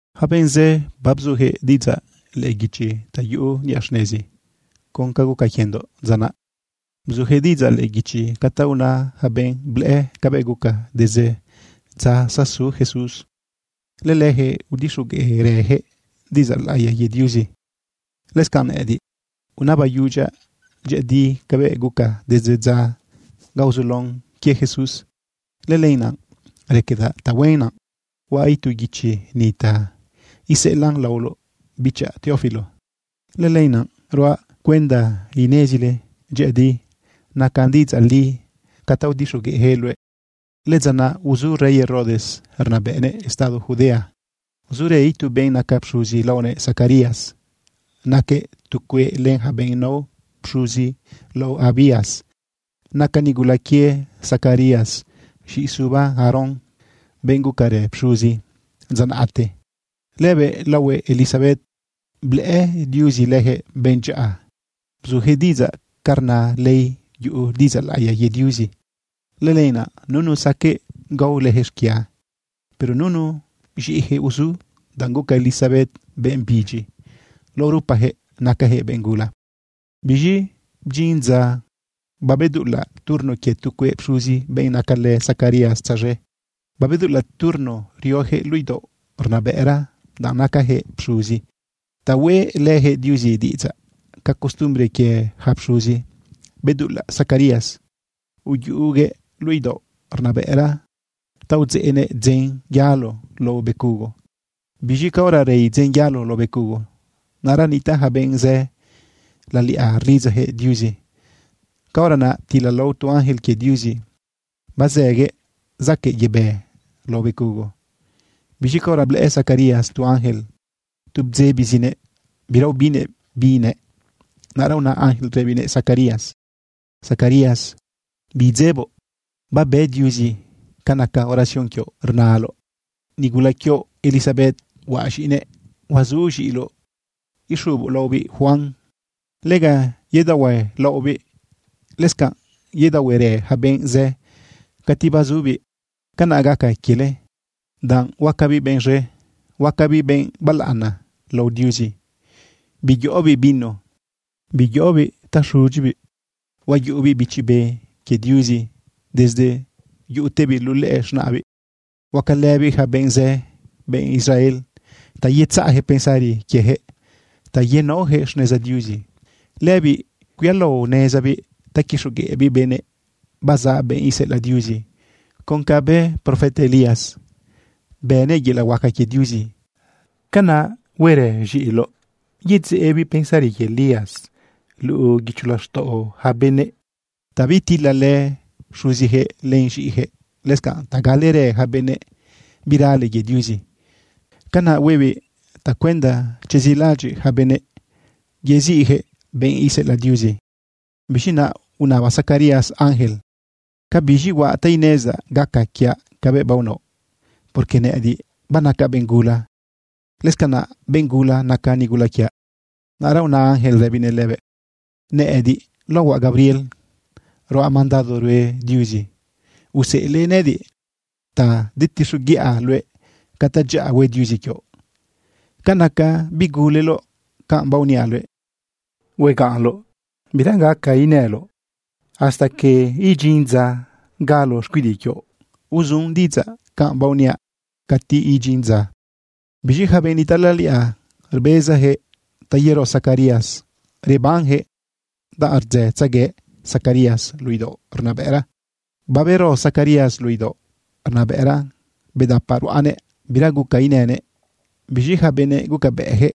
Yaca benꞌ zë babzuyaquëꞌ diꞌidzaꞌ lëꞌë guichi ta yuꞌu niꞌa xnezi con ca guca quiendoꞌ dza naꞌ. Bzuyaquëꞌ diꞌidzaꞌ lëꞌë guichi ca ta una yaca benꞌ blëꞌë cabëꞌ guca desde dza zasu Jesús. Lëleyaquëꞌ udixogueꞌrëyaquëꞌ diꞌidzaꞌ laꞌiya quie Diuzi. Lëscanꞌ nëꞌëdiꞌ unabaꞌyudyaꞌ dyëꞌëdi cabëꞌ guca desde dza ga uzulaon quie Jesús. Lëlenaꞌ raquedaꞌ tahuen naꞌ huaꞌ itu guichi ni ta iseꞌelaꞌn laoloꞌ bichaꞌ Teófilo. Lëlenaꞌ ruaꞌ cuenda inezile dyëꞌëdi nacan diꞌidzaꞌ li ca ta udixogueꞌyaquëꞌ luëꞌ. Lëdza naꞌ uzu rey Herodes rnabëꞌnëꞌ estado Judea, zurë itu benꞌ naca pxuzi laonëꞌ Zacarías. Naquëꞌ tu cueꞌ len yaca benꞌ nao pxuzi lao Abías. Naca nigula quie Zacarías z̃iꞌi suba Aarón, benꞌ gucarë pxuzi dza naꞌte. Lëbëꞌ laohuëꞌ Elisabet. Blëꞌë Diuzi leyaquëꞌ benꞌ dyaꞌa. Bzuyaquëꞌ diꞌidzaꞌ ca rna ley yuꞌu diꞌidzaꞌ laꞌiya quie Diuzi. Lëlenaꞌ nunu saqueꞌ gao leyaquëꞌ xquia. Pero nunu z̃iꞌiyaquëꞌ uzu, danꞌ guca Elisabet benꞌ bidyi. Lao rupayaquëꞌ nacayaquëꞌ benꞌ gula. Biz̃i bdyin dza babedulaꞌ turno quie tu cueꞌ pxuzi benꞌ nacalë Zacarías tzaz̃e. Babedulaꞌ turno rioyaquëꞌ luꞌu idaoꞌ rnabëꞌra, danꞌ nacayaquëꞌ pxuzi ta hueꞌlëyaquëꞌ Diuzi diꞌidzaꞌ. Ca costumbre quie yaca pxuzi bedulaꞌ Zacarías uyuꞌuguëꞌ luꞌu idaoꞌ rnabëꞌra ta udzeꞌnëꞌ dzen yalo lao becugo. Biz̃i caora rei dzen yalo lao becugo, naꞌra nitaꞌ yaca benꞌ zë laliꞌa rlidzayaquëꞌ Diuzi. Caora naꞌ ptilalao tu ángel quie Diuzi bazëguëꞌ zaquëꞌ yebë lao becugo. Biz̃i caora blëꞌë Zacarías tu ángel, tu bdzebizinëꞌ, bira ubinnëꞌ bi nëꞌ. Naꞌra una ángel rëbinëꞌ Zacarías: ―Zacarías, bidzeboꞌ, babe Diuzi ca naca oración quioꞌ rnaloꞌ. Nigula quioꞌ Elisabet huaꞌ z̃iꞌinëꞌ huazu z̃iꞌiloꞌ ixuboꞌ laobiꞌ Juan. Lega yedaohuelaꞌobiꞌ. Lëscanꞌ yedaohuerë yaca benꞌ zë cati bazubiꞌ. Canaꞌ gaca quiele danꞌ huacabiꞌ benꞌ z̃e, huacabiꞌ benꞌ balaꞌana lao Diuzi. Biyoꞌobiꞌ vino, biyoꞌobiꞌ ta xudyibiꞌ. Huayuꞌubiꞌ Bichi Be que Diuzi desde yuꞌutebiꞌ luꞌu lëꞌë z̃naꞌbiꞌ. Huacalëbiꞌ yaca benꞌ zë, benꞌ Israel, ta yetzaꞌyaquëꞌ pensari quieyaquëꞌ ta yenaoyaquëꞌ xneza Diuzi. Lëbiꞌ cuialaonezabiꞌ ta quixogueꞌbiꞌ benëꞌ bazaꞌ benꞌ iseꞌelaꞌ Diuzi. Con ca bë profeta Elías, bënëꞌ yelaꞌ huaca quie Diuzi, canaꞌ huerë z̃iꞌiloꞌ yedzeꞌbiꞌ pensari quie Elías luꞌu guicho laxtaꞌo yaca benëꞌ ta bitilalë xuziyaquëꞌ len z̃iꞌiyaquëꞌ, lëscanꞌ ta galerë yaca benꞌ birale quie Diuzi. Canaꞌ huebiꞌ tacuenda chezilaꞌadyiꞌ yaca benëꞌ yeziꞌyaquëꞌ benꞌ iseꞌelaꞌ Diuzi. Biz̃i naꞌ unaba Zacarías ángel: ―¿Cabiz̃i huaꞌ ta inezdaꞌ gaca quiaꞌ cabëꞌ baonaoꞌ? Porque nëꞌëdiꞌ banacaꞌ benꞌ gula. Lëscanaꞌ benꞌ gula naca nigula quiaꞌ. Naꞌra una ángel rëbinëꞌ lëbëꞌ: ―Nëꞌëdiꞌ laohuaꞌ Gabriel. Ruaꞌ mandado rue Diuzi. Useꞌelëꞌ nëꞌëdiꞌ ta detixoguiꞌa luëꞌ ca tadyaꞌa hue Diuzi quioꞌ. Ca naca biguleloꞌ canꞌ baoniaꞌ luëꞌ, huegaꞌnloꞌ bira gaca inëloꞌ hasta que idyin dza galo xcuidiꞌ quioꞌ. Uzun diꞌidzaꞌ canꞌ baoniaꞌ cati idyin dza. Biz̃i yaca benꞌ nitaꞌ laliꞌa, rbezayaquëꞌ ta yero Zacarías rebanyaquëꞌ danꞌ rdzëtzegue Zacarías luꞌu idaoꞌ rnabëꞌra. Babero Zacarías luꞌu idaoꞌ rnabëꞌra bedapaꞌ ruꞌanëꞌ bira guca inënëꞌ. Biz̃i yaca benëꞌ gucabëꞌyaquëꞌ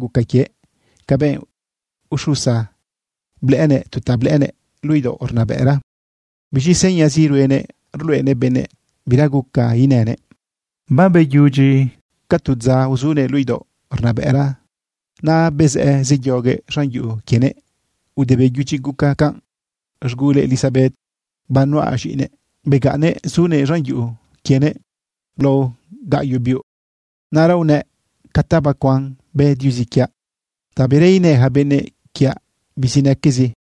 guca quiëꞌ ca benꞌ uxusa. Blëꞌënëꞌ tu ta blëꞌënëꞌ luꞌu idaoꞌ rnabëꞌra. Biz̃i señazi ruenëꞌ rluꞌenëꞌ benëꞌ bira guca inënëꞌ. Babeyudyi ca tu dza uzunëꞌ luꞌu idaoꞌ rnabëꞌra, naꞌ bezëꞌ zeyoguëꞌ z̃an yuꞌu quienëꞌ. Ude beyudyi guca canꞌ, z̃gulëꞌ Elisabet, banuꞌa z̃iꞌinëꞌ, begaꞌnnëꞌ zunëꞌ z̃an yuꞌu quienëꞌ lao gaꞌyoꞌ biuꞌ. Naꞌra unëꞌ: “Ca ta bacuan bë Diuzi quiaꞌ ta bira inë yaca benëꞌ quiaꞌ bizinaquezi.”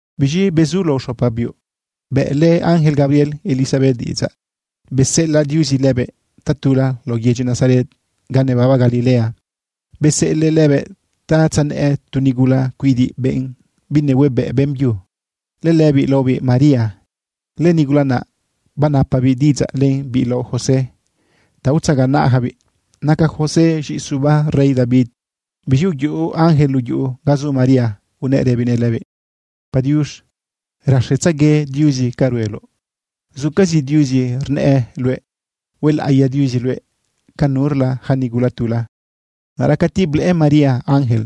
Biz̃i bezu lao xopa biuꞌ bëꞌlë ángel Gabriel Elisabet diꞌidzaꞌ, beseꞌelaꞌ Diuzi lëbëꞌ tatula lao yedyi Nazaret ga nebaba Galilea. Beseꞌelëꞌ lëbëꞌ ta tzanëꞌë tu nigula cuidiꞌ, benꞌ binehuebëꞌ beꞌmbyu. Lëlëbiꞌ laobiꞌ María. Lënigula naꞌ banapabiꞌ diꞌidzaꞌ len biꞌ lao José ta utzaganaꞌyacabiꞌ. Naca José z̃iꞌi suba rey David. Biz̃i uyuꞌu ángel luꞌu yuꞌu ga zu María, unëꞌ rëbinëꞌ lëbiꞌ: ―Padiux, raxetzague Diuzi ca rueloꞌ. Zucazi Diuzi rnëꞌë luëꞌ. Huelaꞌiya Diuzi luëꞌ ca nurla yaca nigula tula. Naꞌra cati blëꞌë María ángel,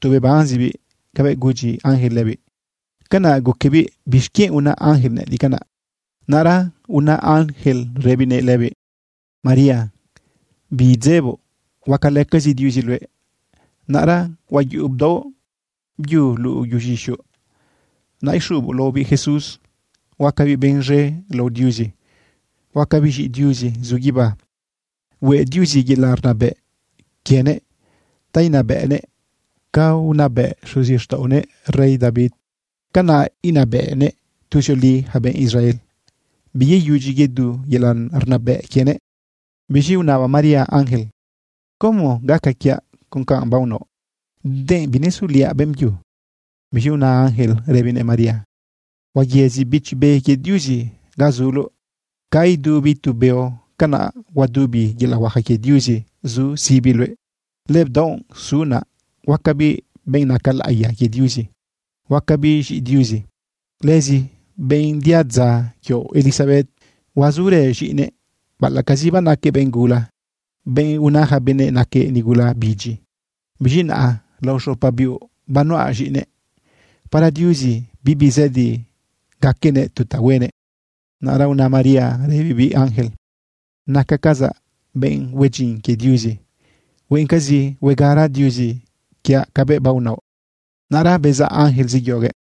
tu bebanzibiꞌ cabëꞌ gudyi ángel lëbiꞌ. Canaꞌ guquebiꞌ: “¿Bixquienꞌ una ángel nëꞌëdiꞌ canaꞌ?” Naꞌra una ángel rëbinëꞌ lëbiꞌ: ―María, bidzeboꞌ huacalëcazi Diuzi luëꞌ. Naꞌra huayuꞌu bdaoꞌ byu luꞌu yuꞌuz̃ixoꞌ. Naꞌ ixuboꞌ laobiꞌ Jesús. Huacabiꞌ benꞌ z̃e lao Diuzi. Huacabiꞌ z̃iꞌi Diuzi zu guibá. Hueꞌ Diuzi yelaꞌ rnabëꞌ quienëꞌ ta inabëꞌnëꞌ ca unabëꞌ xuzixtaꞌonëꞌ rey David. Canaꞌ inabëꞌnëꞌ tuzioli yaca benꞌ Israel. Biyeyudyi yedu yelaꞌ rnabëꞌ quienëꞌ. Biz̃i unaba María ángel: ―¿Como gaca quiaꞌ con ca baonaoꞌ, denꞌ binesuliaꞌ beꞌmbyu? Biz̃i una ángel rëbinëꞌ María: ―Huayëzi Bichi Be quie Diuzi ga zuloꞌ. Ca idubi tu beo, canaꞌ huadubi yelaꞌ huaca quie Diuzi zu sibi luëꞌ. Lëbdaoꞌ su naꞌ, huacabiꞌ benꞌ naca laꞌiya quie Diuzi, huacabiꞌ z̃iꞌi Diuzi. Lëzi benꞌ diadza quioꞌ Elisabet, huazurë z̃iꞌinëꞌ baꞌalaꞌcazi banaquëꞌ benꞌ gula, benꞌ una yaca benëꞌ naquëꞌ nigula bidyi. Biz̃i naꞌa lao xopa biuꞌ banuꞌa z̃iꞌinëꞌ. Para Diuzi bibi zëdi gaquenëꞌ tu ta huenëꞌ. Naꞌra una María rëbibiꞌ ángel: ―Nacacazaꞌ benꞌ hue dyin quie Diuzi. Hueꞌencazi huegara Diuzi quiaꞌ cabëꞌ baonaoꞌ. Naꞌra bezaꞌ ángel zeyoguëꞌ.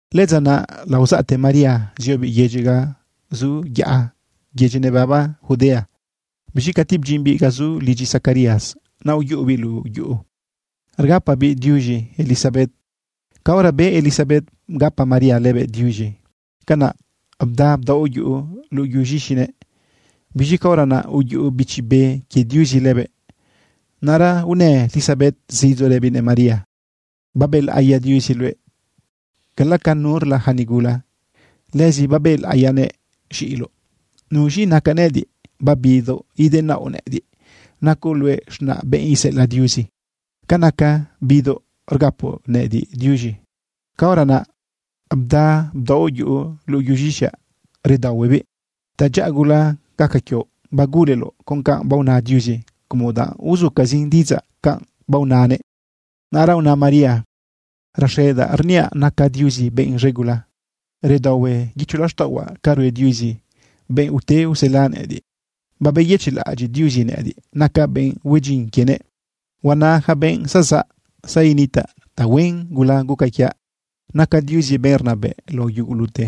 Lëdza naꞌ, laozaꞌte María ziobiꞌ yedyi ga zu yaꞌa, yedyi nebaba Judea. Biz̃i cati bdyimbiꞌ ga zu lidyi Zacarías, naꞌ uyuꞌubiꞌ luꞌu yuꞌu rgapabiꞌ diuz̃i Elisabet. Caora be Elisabet bgapa María lëbëꞌ diuz̃i, canaꞌ bda bdaoꞌ yuꞌu luꞌu yuꞌuz̃ixinëꞌ. Biz̃i caora naꞌ uyuꞌu Bichi Be quie Diuzi lëbëꞌ. Naꞌra unë Elisabet zidzo rëbinëꞌ María: ―Babëlaꞌiya Diuzi luëꞌ cala ca nurla yaca nigula. Lëzi babëlaꞌiyanëꞌ z̃iꞌiloꞌ. ¿Nuz̃i nacaꞌ nëꞌëdiꞌ babidoꞌ idenaoꞌ nëꞌëdiꞌ? Nacoꞌ luëꞌ z̃naꞌ benꞌ iseꞌelaꞌ Diuzi. Ca naca bidoꞌ rgapoꞌ nëꞌëdiꞌ diuz̃i, caora naꞌ bda bdaoꞌ yuꞌu luꞌu yuꞌuz̃ixaꞌ redaohuebiꞌ. Tadyaꞌa gula gaca quioꞌ baguleloꞌ con canꞌ baona Diuzi como danꞌ uzucazin diꞌidzaꞌ canꞌ baonanëꞌ. Naꞌra una María: Raxedaꞌ rniaꞌ naca Diuzi benꞌ z̃e gula. Redaohue guicho laxtaꞌohuaꞌ ca rue Diuzi, benꞌ ute usela nëꞌëdiꞌ. Babeyëchiꞌlaꞌadyiꞌ Diuzi nëꞌëdiꞌ, nacaꞌ benꞌ hue dyin quienëꞌ. Huana yaca benꞌ zazaꞌ zanitaꞌ tahuen gula guca quiaꞌ. Naca Diuzi benꞌ rnabëꞌ lao yugulute.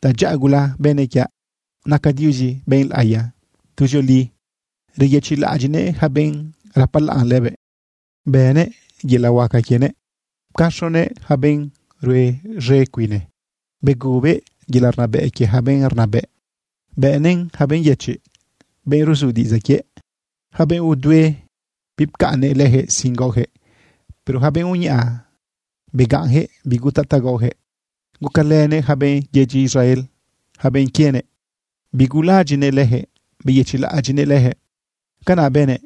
Tadyaꞌa gula bënëꞌ quiaꞌ. Naca Diuzi benꞌ laꞌiya. Tuzioli reyëchiꞌlaꞌadyiꞌnëꞌ yaca benꞌ rapalaꞌn lëbëꞌ. Bënëꞌ yelaꞌ huaca quienëꞌ. Pcaxonëꞌ yaca benꞌ rue z̃e cuine. Begubëꞌ yelaꞌ rnabëꞌ quie yaca benꞌ rnabëꞌ, bëꞌnëꞌn yaca benꞌ yëchiꞌ, benꞌ ruzu diꞌidzaꞌ quiëꞌ. Yaca benꞌ udue, bipcaꞌnnëꞌ leyaquëꞌ sin gaoyaquëꞌ, pero yaca benꞌ uñaꞌa, begaꞌnyaquëꞌ bigutaꞌ ta gaoyaquëꞌ. Gucalënëꞌ yaca benꞌ yedyi Israel, yaca benꞌ quienëꞌ. Bigulalaꞌadyiꞌnëꞌ leyaquëꞌ beyëchiꞌlaꞌadyiꞌnëꞌ leyaquëꞌ. Canaꞌ bënëꞌ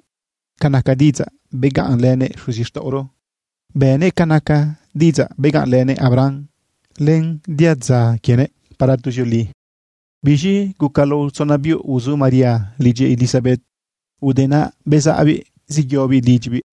ca naca diꞌidzaꞌ begaꞌnlënëꞌ xuzixtaꞌoro, bënëꞌ ca naca diꞌidzaꞌ begaꞌnlënëꞌ Abram len diadza quienëꞌ para tuzioli. Biz̃i guca lao tzona biuꞌ uzu María lidyi Elisabet. Ude naꞌ bezaꞌbiꞌ zeyobiꞌ lidyibiꞌ.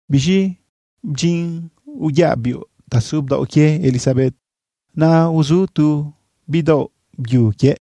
Biz̃i bdyin uyaꞌ biuꞌ ta su bdaoꞌ quie Elisabet, naꞌ uzu tu bidaoꞌ byu quiëꞌ.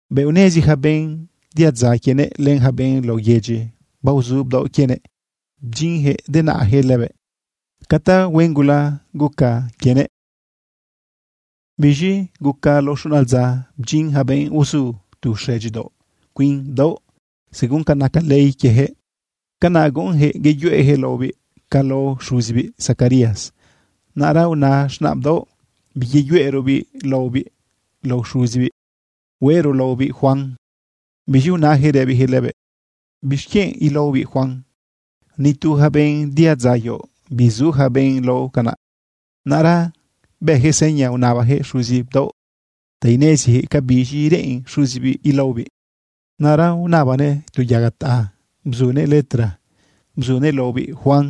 Bëꞌ unezi yaca benꞌ diadza quienëꞌ, len yaca benꞌ lao yedyi baozu bdaoꞌ quienëꞌ, bdyinyaquëꞌ denaꞌyaquëꞌ lëbëꞌ ca tahuen gula guca quienëꞌ. Biz̃i guca lao xuna dza, bdyin yaca benꞌ uzu tu xëdyidaoꞌ cuin bdaoꞌ según ca naca ley quieyaquëꞌ. Canaꞌ guꞌunyaquëꞌ yeyuꞌeyaquëꞌ laobiꞌ ca lao xuzibiꞌ Zacarías. Naꞌra una z̃naꞌ bdaoꞌ: ―Biyeyuꞌero laobiꞌ lao xuzibiꞌ. Hueꞌro laobiꞌ Juan. Biz̃i unayaquëꞌ rëbiyaquëꞌ lëbëꞌ: ―¿Bixquienꞌ ilaobiꞌ Juan? Ni tu yaca benꞌ diadza quioꞌ bizu yaca benꞌ lao canaꞌ. Naꞌra bëyaquëꞌ seña unabayaquëꞌ xuzi bdaoꞌ ta ineziyaquëꞌ ca biz̃i reꞌen xuzibiꞌ ilaobiꞌ. Naꞌra unabanëꞌ tu yaga taꞌa bzuguëꞌ letra bzunëꞌ: “Laobiꞌ Juan.”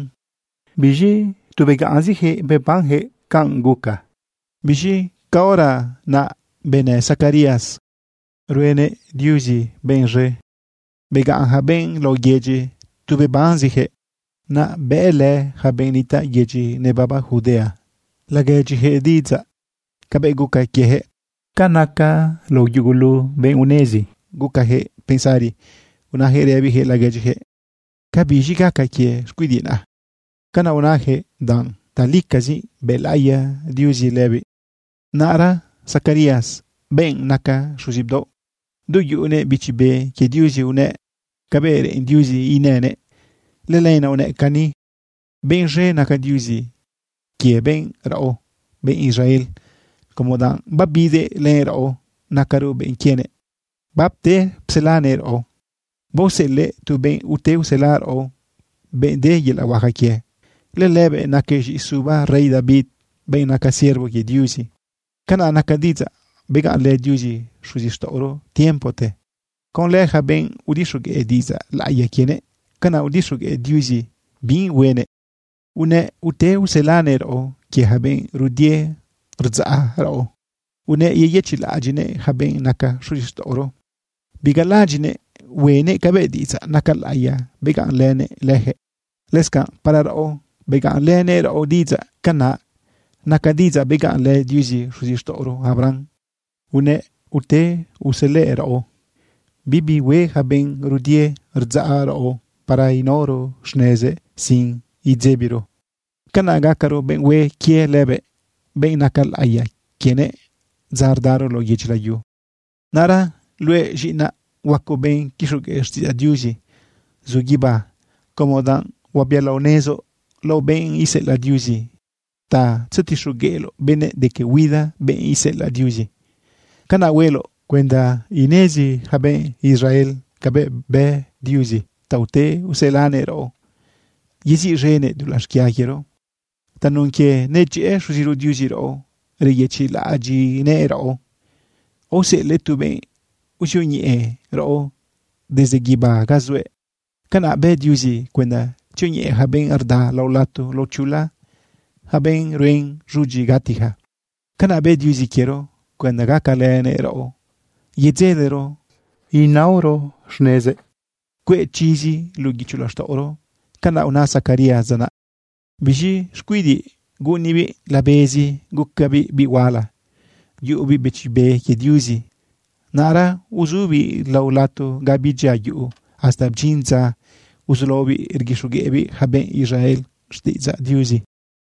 Biz̃i tu begaꞌnziyaquëꞌ bebanyaquëꞌ canꞌ guca. Biz̃i caora naꞌ benë Zacarías, ruenëꞌ Diuzi benꞌ z̃e. Begaꞌn yaca benꞌ lao yedyi tu bebanziyaquëꞌ. Naꞌ bëꞌlë yaca benꞌ nitaꞌ yedyi nebaba Judea laguedyiyaquëꞌ diꞌidzaꞌ cabëꞌ guca quieyaquëꞌ. Ca naca lao yugulu benꞌ unezi, gucayaquëꞌ pensari unayaquëꞌ rëbiyaquëꞌ laguedyiyaquëꞌ: ―¿Ca biz̃i gaca quie xcuidiꞌ naꞌ? Canaꞌ unajëꞌ danꞌ talicazi bëlaꞌiya Diuzi lëbiꞌ. Naꞌra Zacarías, benꞌ naca xuzi bdaoꞌ, du yuꞌunëꞌ Bichi Be quie Diuzi, unëꞌ cabëꞌ reꞌen Diuzi inënëꞌ. Lëlenaꞌ unëꞌ cani: Benꞌ z̃e naca Diuzi quie benꞌ raꞌo, benꞌ Israel, como danꞌ babidëꞌ len raꞌo, nacaro benꞌ quienëꞌ, bapte pselanëꞌ raꞌo. Baoseꞌelëꞌ tu benꞌ ute usela raꞌo, benꞌ de yelaꞌ huaca quie. Lëlëbëꞌ naquëꞌ z̃iꞌi suba rey David, benꞌ naca siervo quie Diuzi. Canaꞌ naca diꞌidzaꞌ begaꞌnlë Diuzi xuzixtaꞌoro tiempote. Conlë yaca benꞌ udixogueꞌ diꞌidzaꞌ laꞌiya quienëꞌ, canaꞌ udixogueꞌ Diuzi binꞌ huenëꞌ. Unëꞌ ute uselanëꞌ raꞌo quie yaca benꞌ rudie rdzaꞌ raꞌo. Unëꞌ yeyëchiꞌlaꞌadyiꞌnëꞌ yaca benꞌ naca xuzixtaꞌoro. Bigalaꞌadyiꞌnëꞌ huenëꞌ cabëꞌ diꞌidzaꞌ naca laꞌiya begaꞌnlënëꞌ leyaquëꞌ. Lëscanꞌ para raꞌo, begaꞌnlënëꞌ raꞌo diꞌidzaꞌ. Canaꞌ naca diꞌidzaꞌ begaꞌnlë Diuzi xuzixtaꞌoro Abraham. Unëꞌ ute uselëꞌ raꞌo bibi hue yaca benꞌ rudie rdzaꞌ raꞌo para naoro xnezëꞌ sin idzebiro. Canaꞌ gacaro benꞌ hue quie lëbëꞌ, benꞌ naca laꞌiya quienëꞌ dza rdaro lao yedyi layu. Naꞌra luëꞌ z̃iꞌinaꞌ, huacoꞌ benꞌ quixogueꞌ xtiꞌidzaꞌ Diuzi zu guibá, como danꞌ huabialaonezoꞌ lao benꞌ iseꞌelaꞌ Diuzi ta tzetixogueꞌloꞌ benëꞌ de que huida benꞌ iseꞌelaꞌ Diuzi. Canaꞌ hueloꞌ cuenda inezi yaca benꞌ Israel cabëꞌ bë Diuzi ta ute uselanëꞌ raꞌo, yeziꞌz̃enëꞌ dulaꞌ xquia quiero. Tanun quie nedyëꞌë Xuziro Diuzi raꞌo reyëchiꞌlaꞌadyiꞌnëꞌ raꞌo, aoseꞌelëꞌ tu benꞌ uzioñeꞌe raꞌo desde guibá ga zuëꞌ. Canaꞌ bë Diuzi cuenda tzioñeꞌe yaca benꞌ rda lao lato lao chula, yaca benꞌ ruen z̃udyi gatiyaca. Canaꞌ bë Diuzi quiero cuenda gacalënëꞌ raꞌo, yedzelero naoro xnezëꞌ, cueꞌ chizi luꞌu guicho laxtaꞌoro. Canaꞌ una Zacarías dza naꞌ. Biz̃i xcuidiꞌ guꞌunibiꞌ labezi, gucabiꞌ biꞌ huala, yuꞌubiꞌ Bichi Be quie Diuzi. Naꞌra uzubiꞌ lao lato ga bidyia yuꞌu hasta bdyin dza uzulaobiꞌ rguixogueꞌbiꞌ yaca benꞌ Israel xtiꞌidzaꞌ Diuzi.